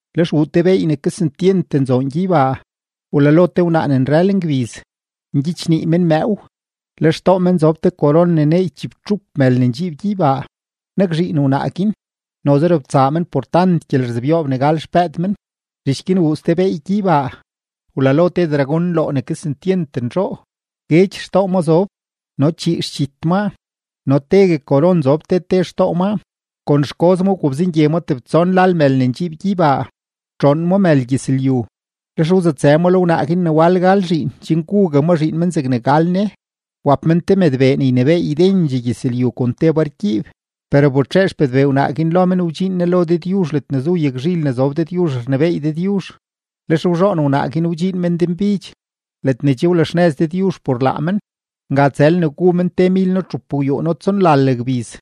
Lex wuu te beey ne kesentyent nzoon gyeybaa: wlalo te wnaa ne nrël ngbiz, ngyichnii men mëëw, le xtoo men zob te koron ne neey chibtxup mël ne ndxiib gyeybaa. Nakzhiin wnaa guin, noze robtsaa men por tant gyelerzebyoob ne gal xpëëd men. Zhich guin wuu ste beey gyeybaa: wlalo te dragón nloo ne kesentyent nzhoo; guedx xtoo ma zob no le chii xdxit maa no tegue koron zob te te xtoo maa. Kon xgoz ma wgobzengye ma tebtson lal mël ne ndxiib gyeybaa, wtxoon ma mël gyëzlyu. Lex wzutsë ma lo wnaa guin ne wal gal zhiin chen gugue ma zhiin men zegne gal ne. Wap men te mëdbee ne ynebééy ydendxee gyëzlyu kon te bargyiib. Per wbetxee xpëdbee wnaa guin lo men wdxiin ne lo Dëdyuzh ledne zu yagzhil ne zob Dëdyuzh rnebééy Dëdyuzh. Lex wzhoon wnaa guin wdxiin men denbidx ledne che wlaxnëz Dëdyuzh por laa men; nga tsël ne gu men temilno-txupgwyuuno-tsonlal gbiz.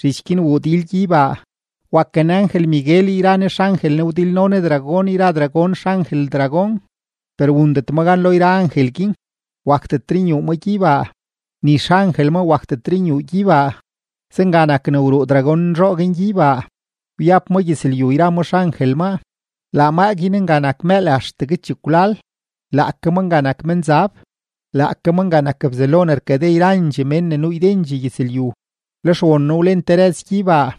Zhich guin wuu dil gyeybaa: waken angel-Miguel yra ne xangel ne wdilno ne dragón yra dragón xangel dragón. Per wundet ma gan lo yra angel guin, wakdetre nyuu ma gyeybaa, ni xangel maa wakdetre nyuu gyeybaa. Zenga nak ne wruu dragón nzhoo guin gyeybaa, wyab ma gyëzlyu yra ma xangel maa. Laa maa guin nga nak mëël axtegue chekwlal, laake ma nak menzab, laake ma nak Bzelo ne rkade yrandxee mén ne nuu ydendxee gyëzlyu. Lex won noo wlen te rëz gyeybaa,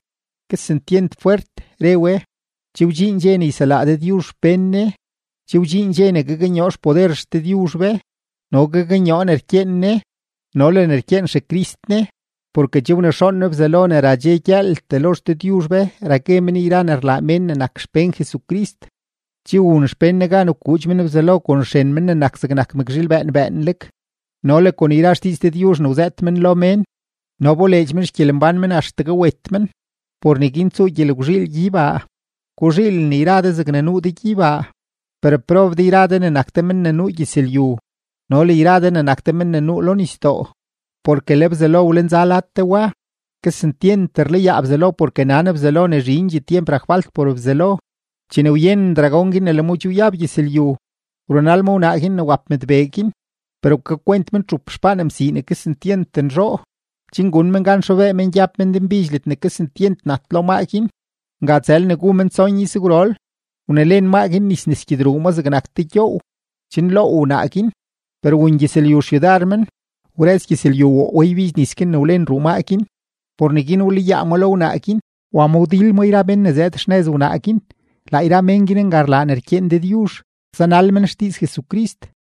kesentyent fwert re we: ―Che wdxiin dxe ne yselaa Dëdyuzh xpén Ne, che wdxiin dxe ne gaknyoo xpoder XDëdyuzh be no gaknyoo ne rkyeen Ne no le ne rkyeen XeCrist Ne; porke che wnexoon Ne Bzelo ne ra dxe gyëëltee lo XDëdyuzh be ra gue men yra ne rlaa mén ne nak xpén Jesucrist. Che wun xpén Ne gan wkuudx men Bzelo kon xren Men ne nak zegnak mëkzhiil bëën bëënleg no le kon yra xdiiz Dëdyuzh ne wzëët men lo mén, no wboleedx men xgyelembán men axtegue wet men. Por neguin tsuu gyelgwzhiil gyeybaa; guzhiilen yra de zegne nuu de gyeybaa. ¡Per prob de yra de ne nak de men ne nuu gyëzlyu no le yra de ne nak de men ne nuu lo nisdoo, porke le Bzelo wlenza lad de wa! Kesentyent rlayaa Bzelo porke nan Bzelo ne zhindxee tyemp rak falt por Bzelo. Chene wyenen dragón guin ne le ma che wyab gyëzlyu, wrunal ma wnaa guin ne wap mëdbee guin. Per wkakwent men txup xpaan msii ne kesentyent nzhoo, chen gun men gan xobee men gyab men denbidx ledne kesentyent nat lo maa guin; nga tsël ne gu men tson izgwrol. Wnelen maa guin nis nes gyedruu maa zegnak te gyoow, chen loow wnaa guin. Per wun gyëzlyu xyudar men, wrëz gyëzlyu woo we ybidx nis guin ne wlen ruu maa guin. Por neguin wlayaa ma lo wnaa guin, wa ma wdil ma yra mén ne zëëd xnëz wnaa guin; laa yra mén guin nga rlaa ne rkyeen Dëdyuzh, zanal men xdiiz Jesucrist.